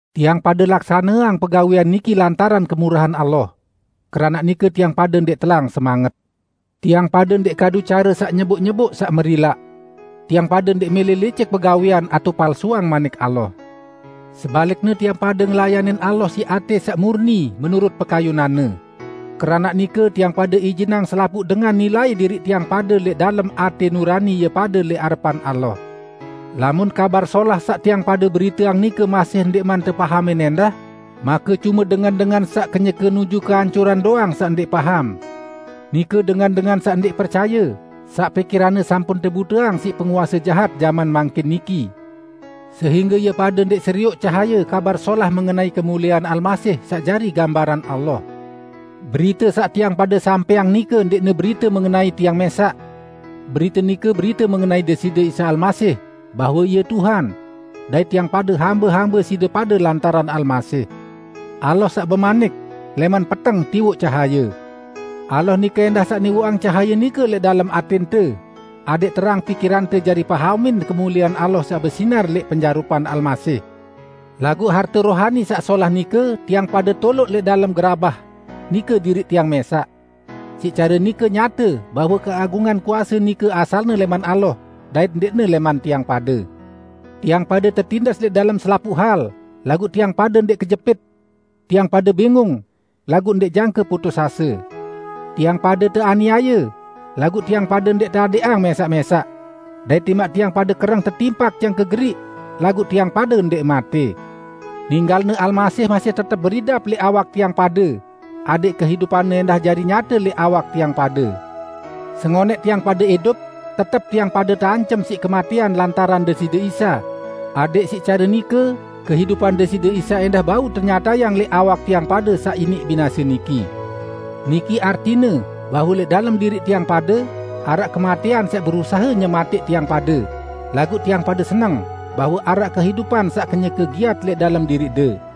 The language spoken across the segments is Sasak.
Tiang pade laksaneang pegawẽan niki lantaran kemurahan Allah. Keranaq nike tiang pade ndẽq telang semanget. Tiang pade ndẽq kadu care saq nyeboq-nyeboq saq merilaq. Tiang pade ndẽq mẽlẽ licik begawẽan atao palsuang Manik Allah. Sebalikne tiang pade ngelayanin Allah siq atẽ saq murni menurut pekayunan-Ne. Keranaq nike, tiang pade ijinang selapuq dengan nilai diriq tiang pade lẽq dalem atẽ nurani ie pade lẽq arepan Allah. Lamun Kabar Solah saq tiang pade beriteang nike masih ndẽqman tepahamin ẽndah, make cume dengan-dengan saq kenyeke nuju keancuran doang saq ndẽq paham, nike dengan-dengan saq ndẽq percaye, saq pikiranne sampun tebuteang siq penguase jahat jaman mangkin niki, sehingge ie pade ndẽq serioq cahaye Kabar Solah mengenai kemuliean Almasih, saq jari gambaran Allah. Berite saq tiang pade sampẽang nike ndẽqne berite mengenai tiang mẽsaq. Berite nike berite mengenai Deside Isa Almasih; bahwe Ie Tuhan; dait tiang pade hambe-hambe side pade lantaran Almasih. Allah saq bemanik, "Lẽman peteng tiwoq cahaye." Allah nike ẽndah saq niwoqang cahaye nike lẽq dalem atẽnte, adẽq terang pikirante jari pahamin kemuliean Allah saq besinar lẽq penjarupan Almasih. Laguq harte rohani saq solah nike tiang pade toloq lẽq dalem gerabah, nike diriq tiang mẽsaq. Siq care nike nyate bahwe keagungan kuase nike asalne lẽman Allah dait ndẽqne lẽman tiang pade. Tiang pade tetindes lẽq dalem selapuq hal, laguq tiang pade ndẽq kejepit. Tiang pade bingung, laguq ndẽq jangke putus ase. Tiang pade teaniaye, laguq tiang pade ndẽq teadẽqang mẽsaq-mẽsaq. Dait timaq tiang pade kereng tetimpak jangke geriq, laguq tiang pade ndẽq matẽ. Ninggal-Ne Almasih masih tetep beridap lẽq awak tiang pade, adẽq kehidupan-Ne ẽndah jari nyate lẽq awak tiang pade. Sengonẽq tiang pade idup, tetep tiang pade teancem siq kematẽan lantaran Deside Isa, adẽq siq care nike kehidupan Deside Isa ẽndah bau tenyatayang lẽq awak tiang pade saq iniq binase niki. Niki artine bahwe lẽq dalem diriq tiang pade, araq kematẽan saq berusahe nyematẽq tiang pade, laguq tiang pade seneng bahwe araq kehidupan saq kenyeke giat lẽq dalem diriqde.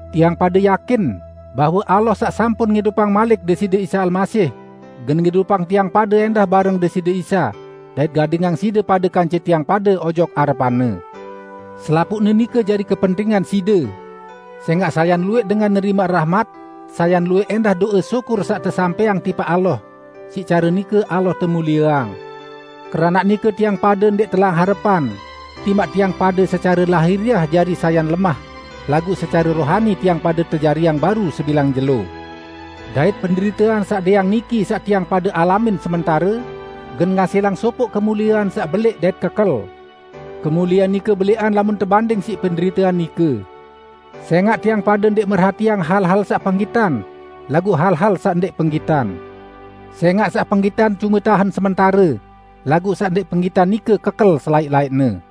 Tiang pade yakin bahwe Allah saq sampun ngidupang malik Deside Isa Almasih, gen ngidupang tiang pade ẽndah bareng Deside Isa, dait gadingang side pade kance tiang pade ojok arepan-Ne. Selapuqne nike jari kepentingan side. Sẽngaq sayan luwẽq dengan nerimaq rahmat, sayan luwẽq ẽndah do'e syukur saq tesampẽang tipaq Allah; siq care nike Allah temulieang. Keranaq nike tiang pade ndẽq telang harepan, timaq tiang pade secare lahiriah jari sayan lemah laguq secare rohani tiang pade tejariang baru sebilang jelo. Dait penderitean saq dẽang niki saq tiang pade alamin sementare, gen ngasilang sopoq kemuliean saq belẽq dait kekel. Kemuliean nike belẽqan lamun tebanding siq penderitean nike. Sẽngaq tiang pade ndẽq merhatiang hal-hal saq penggitan, laguq hal-hal saq ndẽq penggitan. Sẽngaq saq penggitan cume tahen sementare, laguq saq ndẽq penggitan nike kekel selaẽq-laẽqne.